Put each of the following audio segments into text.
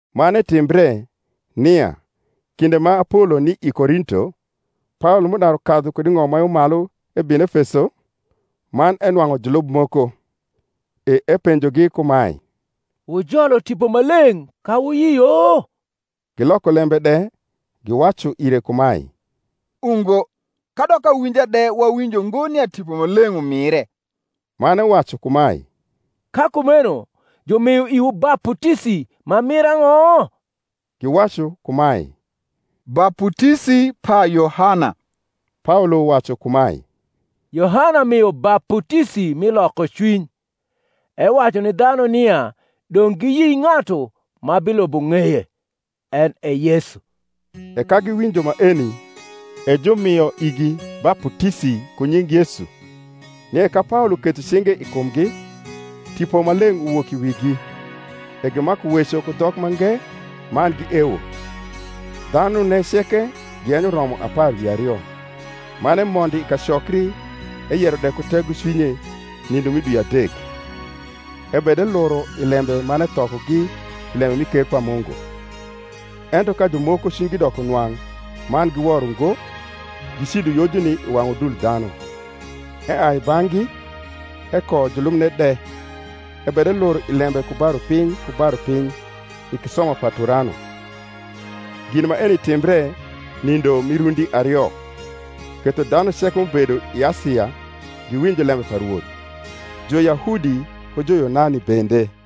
Man etimbre, nia, kinde ma Apolo ni i Korinto, Paolo m’udaru kadhu kud i ng’om ma yo malu ebino Efeso, man enwang’u julub moko: e epenjogi kumae, Wujolo Tipo Maleng’ ka wuyio? Giloko lembe de giwacu ire kumae, Ungo, kadok awinja de wawinjo ngo nia Tipo Maleng’ umire. Man ewacu kumae, Ka kumeno jumio iwu baputisi ma mir ang’o? Giwacu kumae, Baputisi pa Yohana. Paolo wacu kumae, Yohana mio baputisi mi lokocwiny, ewacu ni dhanu nia dong’ giyi ng’atu ma bilubo ng’eye, en e Yesu. E ka giwinjo maeni, e jumio igi baputisi ku nying Yesu. Nie ka Paolo ketho cinge i kumgi, Tipo Maleng’ uwok i wigi; e gimaku weco ku dhok mange, man giewo. Dhanune ceke giyenyo romo apar wi ario. Man emondo i kacokri eyero de ku tegocwinye nindo mi dwi adek, ebedeluro i lembe man ethokogi pi lembe mi ker pa Mungu. Ento ka jumoko cwinygi doko nwang’ man giwor ungo, gicido Yojuni i wang’ udul dhanu, eai i bang’gi, ekoyo julubne de, ebedeluro i lembe ku ba rupiny ku ba rupiny i kisoma pa Turano. Gin maeni timbre nindo mi rundi ario: ketho dhanu ceke m’ubedo i Asia giwinjo lembe pa Rwoth, Juyahudi ku Juyunani bende.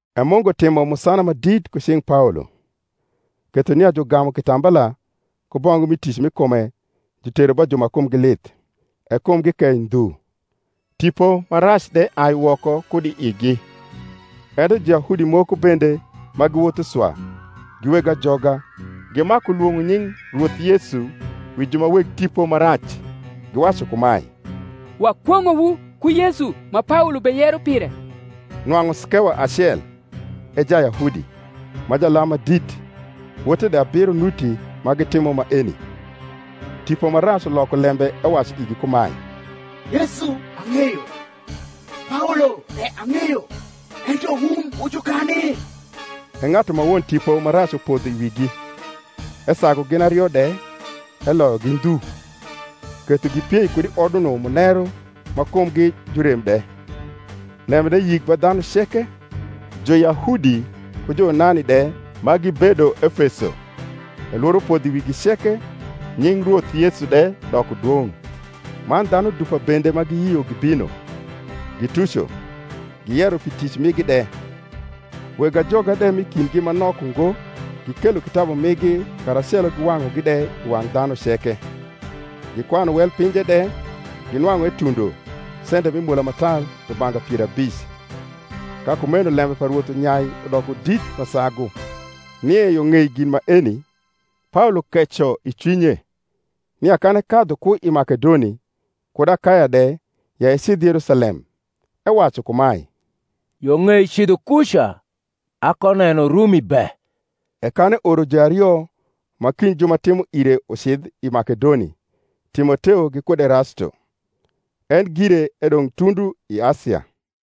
E Mungu timo musana ma dit ku cing’ Paolo: ketho nia jugamu kitambala ku bongu mi tic m’i kume, jutero ba ju ma kumgi lith, e kumgi kei ndhu, tipo ma rac de ai woko kud i igi. Ento Juyahudi moko bende ma giwotho swa, gi weg ajoga, gimaku lwong’o nying Rwoth Yesu wi ju ma weg tipo ma rac giwacu kumae, Wakwong’owu ku Yesu ma Paolo beyero pire. Nwang’u Skewa acel, e Jayahudi, ma jalam ma dit, wote de abiro nuti ma gitimo maeni. Tipo ma rac uloko lembe ewacu igi kumae, Yesu ang’eyo, Paolo de ang’eyo; ento wun wu jukani? E ng’atu ma won tipo ma rac upodho i wigi, esagu gin ario de, eloyogi ndhu, ketho gipiei kud i oduno muneru ma kumgi ju rem de. Lembene yik ba dhanu ceke, Juyahudi ku Juyunani de, ma gibedo Efeso; e lworo podho i wigi ceke, nying Rwoth Yesu de doko dwong’. Man dhanu dupa bende ma giyio gibino, gituco, giyero pi tic migi de. Weg ajoga de m’i kindgi ma nok ungo gikelo kitabu migi karacelo giwang’ugi de i wang’ dhanu ceke; gikwanu wel pinje de, ginwang’u etundo sente mi mola ma tar rubanga pier abic. Ka kumeno lembe pa Rwoth unyai udoko dit ma sagu. Nie yo ng’ei gin maeni, Paolo keco i cwinye, nia kan ekadhu ku i Makedoni kud Akaya de ya ecidh Yerusalem ewacu kumae, Yo ng’ei cidho kuca, akoneno Rumi be. E kan eoro juario ma kind ju ma timo ire ucidh i Makedoni. Timoteo gikud Erasto, en gire edong’ tundu i Asia.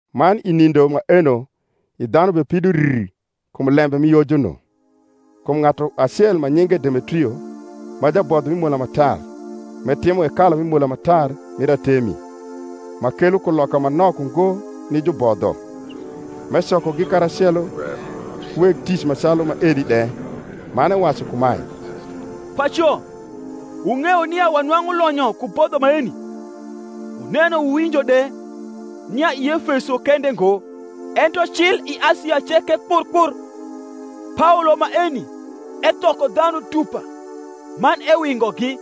Man i nindo maeno i dhanu bepido rr kum lembe mi Yojuno. Kum ng’atu acel ma nyinge Demetrio, ma jabodho mi mola ma tar, m’etimo hekalu mi mola ma tar mir Artemi, ma kelo kuloka ma nok ungo ni jubodho; m’ecokogi karacelo, ku weg tic ma calu maeni de, man ewacu kumae, Paco, wung’eyo nia wanwang’u lonyo ku bodho maeni. Wuneno wuwinjo de, nia i Efeso kende ngo, ento cil i Asia ceke kpr kpr, Paolo maeni ethoko dhanu dupa man ewingogi,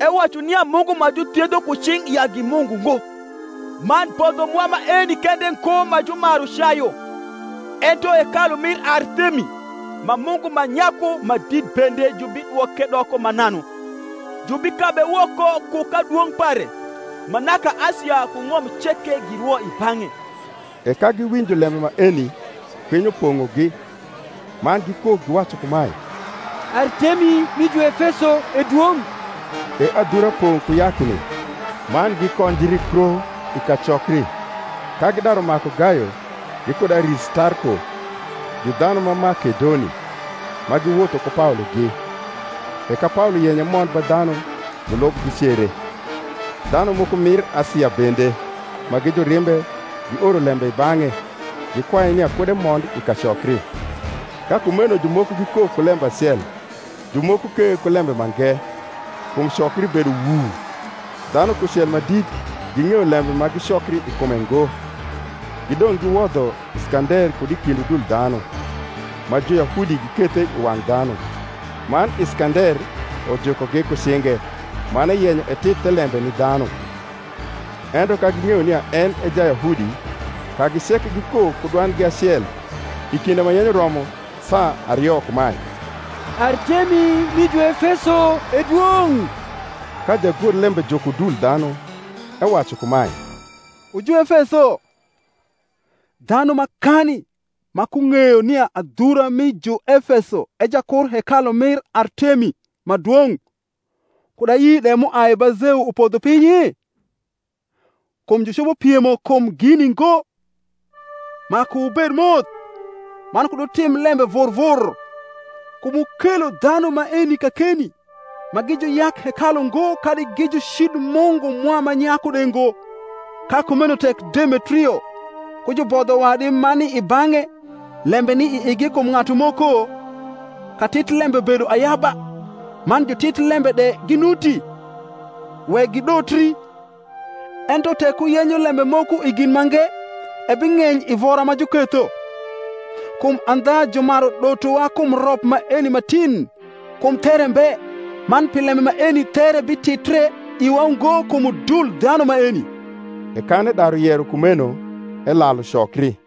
ewacu nia mungu ma juthiedho ku cing’ ya gi mungu ngo: man bodho mwa maeni kende ngo ma jumaru cayu; ento hekalu mir Artemi ma mungu ma nyaku ma dit bende jubidwoke doko mananu, jubikabe woko ku kadwong’ pare ma naka Asia ku ng’om ceke girwo i bang’e. E ka giwinjo lembe maeni kwinyo pong’og, man gikok, giwacu kumae, Artemi mi Juefeso e dwong’. E adhura pong’ ku yakni: man gikonjri kro i kacokri, ka gidaru maku Gayo gikud Aristarko, gi dhanu ma Makedoni, ma giwotho ku Paologi. E ka Paolo yenyo emond ba dhanu, julub gicere. Dhanu moko mir Asia bende, ma gi jurimbe, gioro lembe i bang’e gikwaye nia kud emond i kacokri. Ka kumeno jumoko gikok ku lembe acel, jumoko ke ku lembe mange: kum cokri bedo wuu; dhanu kucel ma dit ging’eyo lembe ma gicokri i kume ngo. Gidong’ giwodho Iskander kud i kind udul dhanu, ma Juyahudi gikethe i wang’ dhanu. Man Iskander ujukogi ku cinge, man eyenyo etit thelembe ni dhanu. Ento ka ging’eyo nia en e Jayahudi, kagi ceke gikok ku dwandgi acel i kinde ma yenyo romo saa ario kumae, Artemi mi Juefeso e dwong’. Ka jagorlembe juko udul dhanu, ewacu kumae, Wu Juefeso, dhanu makani ma kung’eyo nia adhura mi Juefeso e jakur hekalu mir Artemi ma dwong’, kud ayi de m’uai ba Zeu upodho pinyi? Kum jucopo piemo kum gini ngo, maku wubed moth, man kud wutim lembe vur vur. Kum wukelo dhanu maeni kakeni, ma gi juyak hekalu ngo kadi gi jucid mungu mwa ma nyaku de ngo. Ka kumeno tek Demetrio, ku jubodho wadi ma ni i bang’e, lembe ni i igi kum ng’atu moko, katitlembe bedo ayaba, man jutitlembe de ginuti: wek gidotri. Ento tek wuyenyo lembe moko i gin mange ebing’eny i vora ma juketho. Kum andha jumaru dotowa kum rop maeni ma tin, kum there mbe: man pi lembe maeni there bititre iwa ngo kum udul dhanu maeni. E kan edaru yero kumeno, elalu cokri.